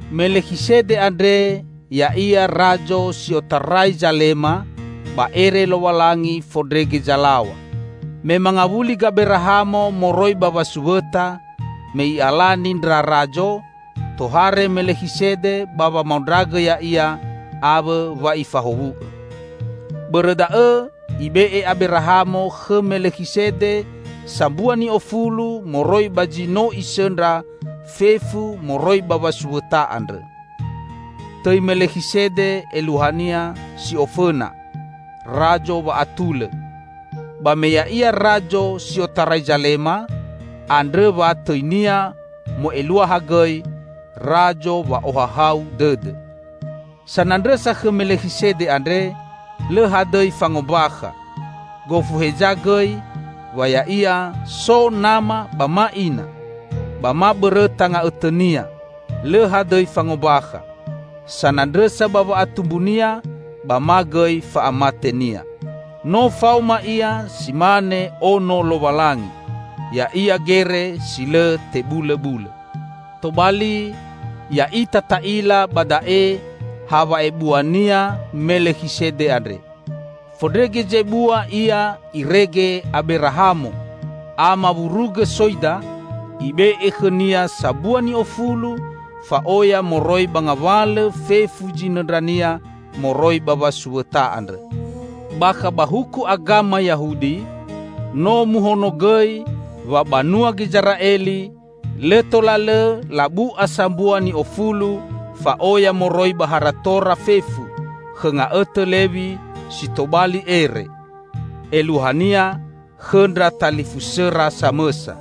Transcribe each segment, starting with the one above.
Melekhisede andre ya'ia razo si otarai Zalema ba ere Lowalangi Fondrege Zalaw̃a. Me mangawuli Gaberahamo moroi ba wasuwõta, me i'alani ndra razo, tohare Melekhisede ba wamaondragõ ya'ia awõ wa ifahowu'õ. Bõrõ da'õ ibe'e Aberahamo khõ Melekhisede sambua ni'ofulu moroi ba zi no isõndra fefu moroi ba wasuwõta andrõ. (Tõi Melekhisede eluahania, si ofõna, "Razo Wa'atulõ", ba me ya'ia razo si otarai Zalema, andrõ wa tõinia mo'eluaha gõi "Razo Wa'ohahau Dõdõ".) Sanandrõsa khõ Melekhisede andre lõ hadõi fangombakha, gofu heza gõi, wa ya'ia so nama ba ma ina, ba ma bõrõta nga'õtõnia lõ hadõi fangombakha, sanandrõsa ba wa'atumbunia, ba ma gõi fa'amatenia. No faoma ia si mane Ono Lowalangi; ya'ia gere si lõ tebulõbulõ. Tobali, ya'ita ta'ila ba da'e ha wa'ebuania Melekhisede andre; fondrege zebua, ia irege Aberahamo, ama wurugõ soida, ibe'e khõnia sambua ni'ofulu fa'oya moroi ba ngawalõ fefu zinõndrania moroi ba wasuwõta andrõ. Bakha ba huku agama Yahudi no muhonogõi wa banua Gizera'eli lõ tola lõ labu'a sambua ni'ofulu fa'oya moroi ba haratora fefu khõ nga'õtõ Lewi si tobali ere -- eluahania khõ ndra talifusõra samõsa.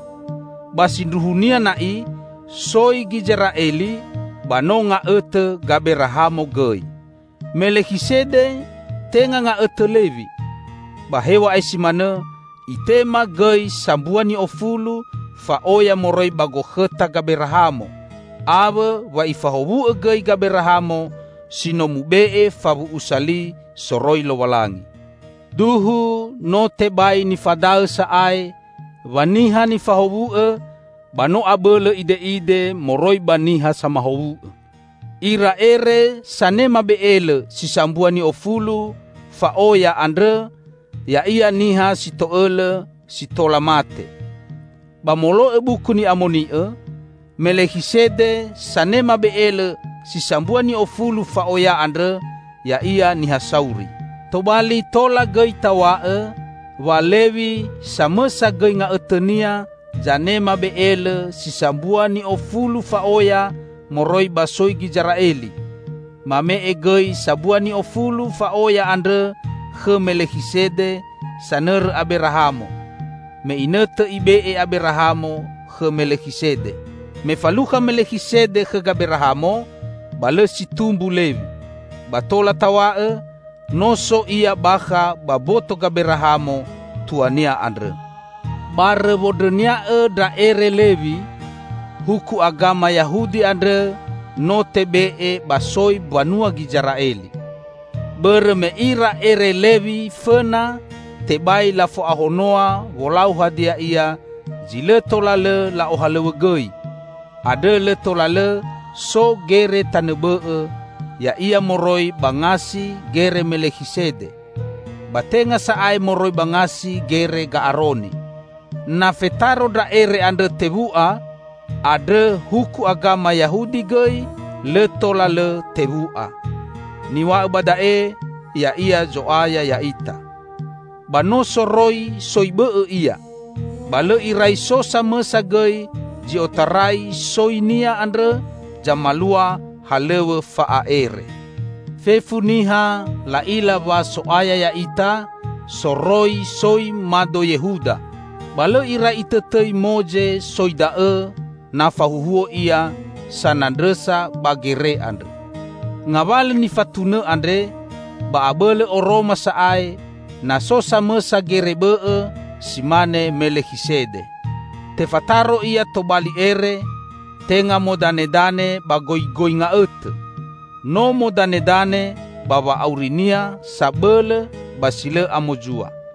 Ba sindruhunia na'i soi Gizera'eli ba no nga'õtõ Gaberahamo gõi. Melekhisede tenga nga'õtõ Lewi, ba hew̃a'ae si manõ itema gõi sambua ni'ofulu fa'oya moroi ba gokhõta Gaberahamo, awõ wa ifahowu'õ gõi Gaberahamo si no mube'e fawu'usa li soroi Lowalangi. Duhu no tebai nifadaõ sa'ae wa niha nifahowu'õ ba no abõlõ ide'ide moroi ba niha samahowu'õ. Ira Ere sanema be'elõ si sambua ni'ofulu fa'oya andrõ ya'ia niha si to'õlõ si tola mate. Ba molo'õ Buku Ni'amoni'õ, Melekhisede sanema be'elõ si sambua ni'ofulu fa'oya andrõ ya'ia niha sauri. Tobali tola gõi taw̃a'õ, wa Lewi -- samõsa gõi nga'õtõnia zanema be'elõ si sambua ni'ofulu fa'oya moroi ba soi Gizera'eli -- mame'e gõi sambua ni'ofulu fa'oya andrõ khõ Melekhisede sanõrõ Aberahamo, me inõtõ ibe'e Aberahamo khõ Melekhisede. Me falukha Melekhisede khõ Gaberahamo, ba lõ si tumbu Lewi; ba tola taw̃a'õ, no so ia bakha ba mboto Gaberahamo, tuania andrõ. Barõ wondrõnia'õ ndra ere Lewi, huku agama Yahudi andrõ no tebe'e ba soi mbanua Gizera'eli. Bõrõ me ira ere Lewi fõna tebai lafo'ahonoa wolau hadia ia zi lõ tola lõ la'ohalõw̃õgõi, andrõ lõ tola lõ so gere tanõ bõ'õ, ya'ia moroi ba ngasi gere Melekhisede, ba tenga sa'ae moroi ba ngasi Gere Ga'aroni! Na fetaro ndra ere andrõ tewu'a, andrõ huku agama Yahudi gõi lõ tola lõ tewu'a. Niw̃a'õ ba da'e ya'ia Zo'aya ya'ita. Ba no soroi soi bõ'õ Ia, ba lõ irai so samõsa gõi zi otarai soi-Nia andrõ zamalua halõw̃õ fa'a'ere. Fefu niha la'ila wa So'aya ya'ita, soroi soi mado Yehuda; ba lõ irai itõtõi Moze soi da'õ na fahuhuo ia sanandrõsa ba gere andrõ. Ngawalõ nifatunõ andre ba abõlõ oroma sa'ae, na so samõsa gere bõ'õ si mane Melekhisede. Tefataro Ia tobali ere, tenga modanedane ba goigoi nga'õtõ, no modanedane ba wa'auri-Nia sabõlõ ba si lõ amozua.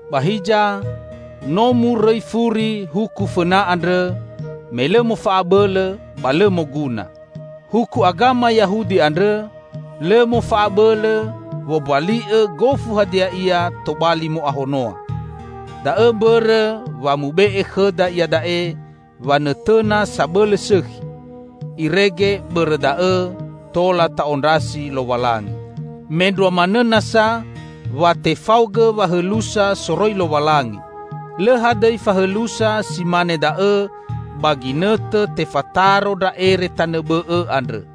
Ba hiza, no murõi furi huku fõna andrõ, me lõ mofa'abõlõ ba lõ moguna. Huku agama Yahudi andrõ, lõ mofa'abõlõ wombali'õ gofu hadia ia tobali mo'ahonoa. Da'õ mbõrõ wa mube'e khõda iada'e wanõtõna sabõlõ sõkhi; irege bõrõ da'õ tola ta'ondrasi Lowalangi. Mendrua manõ nasa, wa tefaogõ wahõlusa soroi Lowalangi. Lõ hadõi fahõlusa si mane da'õ, ba ginõtõ tefataro ndra ere tanõ bõ'õ andrõ.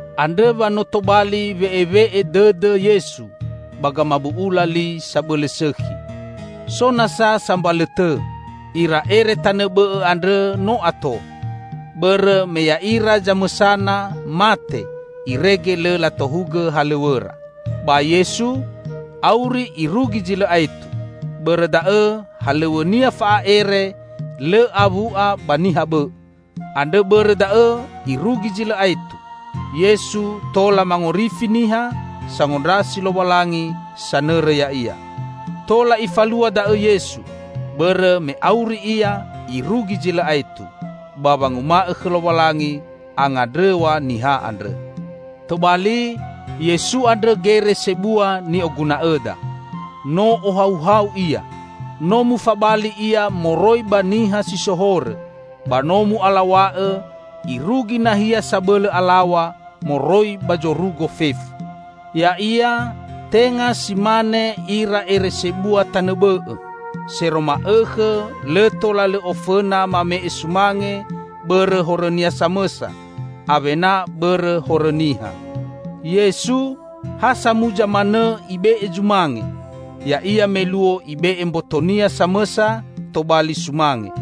Andrõ wa no tobali we'ewe'e dõdõ Yesu ba gamabu'ula li sabõlõ sõkhi. So nasa sambalõ tõ: Ira ere tanõ bõ'õ andrõ no ato, bõrõ me ya'ira zamõsana mate irege lõ latohugõ halõw̃õra. Ba Yesu, auri irugi zi lõ aetu, bõrõ da'õ halõw̃õ-Nia fa'a'ere lõ awu'a ba niha bõ'õ. Andrõ bõrõ da'õ irugi zi lõ aetu, Yesu tola mangorifi niha sangondrasi Lowalangi sanõrõ Ya'ia. Tola Ifalua da'õ Yesu bõrõ me auri Ia irugi zi lõ aetu ba wanguma'õ khõ Lowalangi angandrõw̃a niha andrõ. Tobali, Yesu andrõ Gere Sebua ni'oguna'õda. No ohauhau Ia: No mufabali Ia moroi ba niha si so horõ, ba no mu'alaw̃a'õ irugi nahia sabõlõ alaw̃a moroi ba zorugo fefu. Ya'ia tenga si mane ira ere sebua tanõ bõ'õ, sero ma'õkhõ lõ tola lõ ofõna mame'e sumange bõrõ horõnia samõsa, awena bõrõ horõ niha. Yesu, ha samuza manõ Ibe'e zumange, ya'ia me luo Ibe'e mboto-Nia samõsa tobali sumange.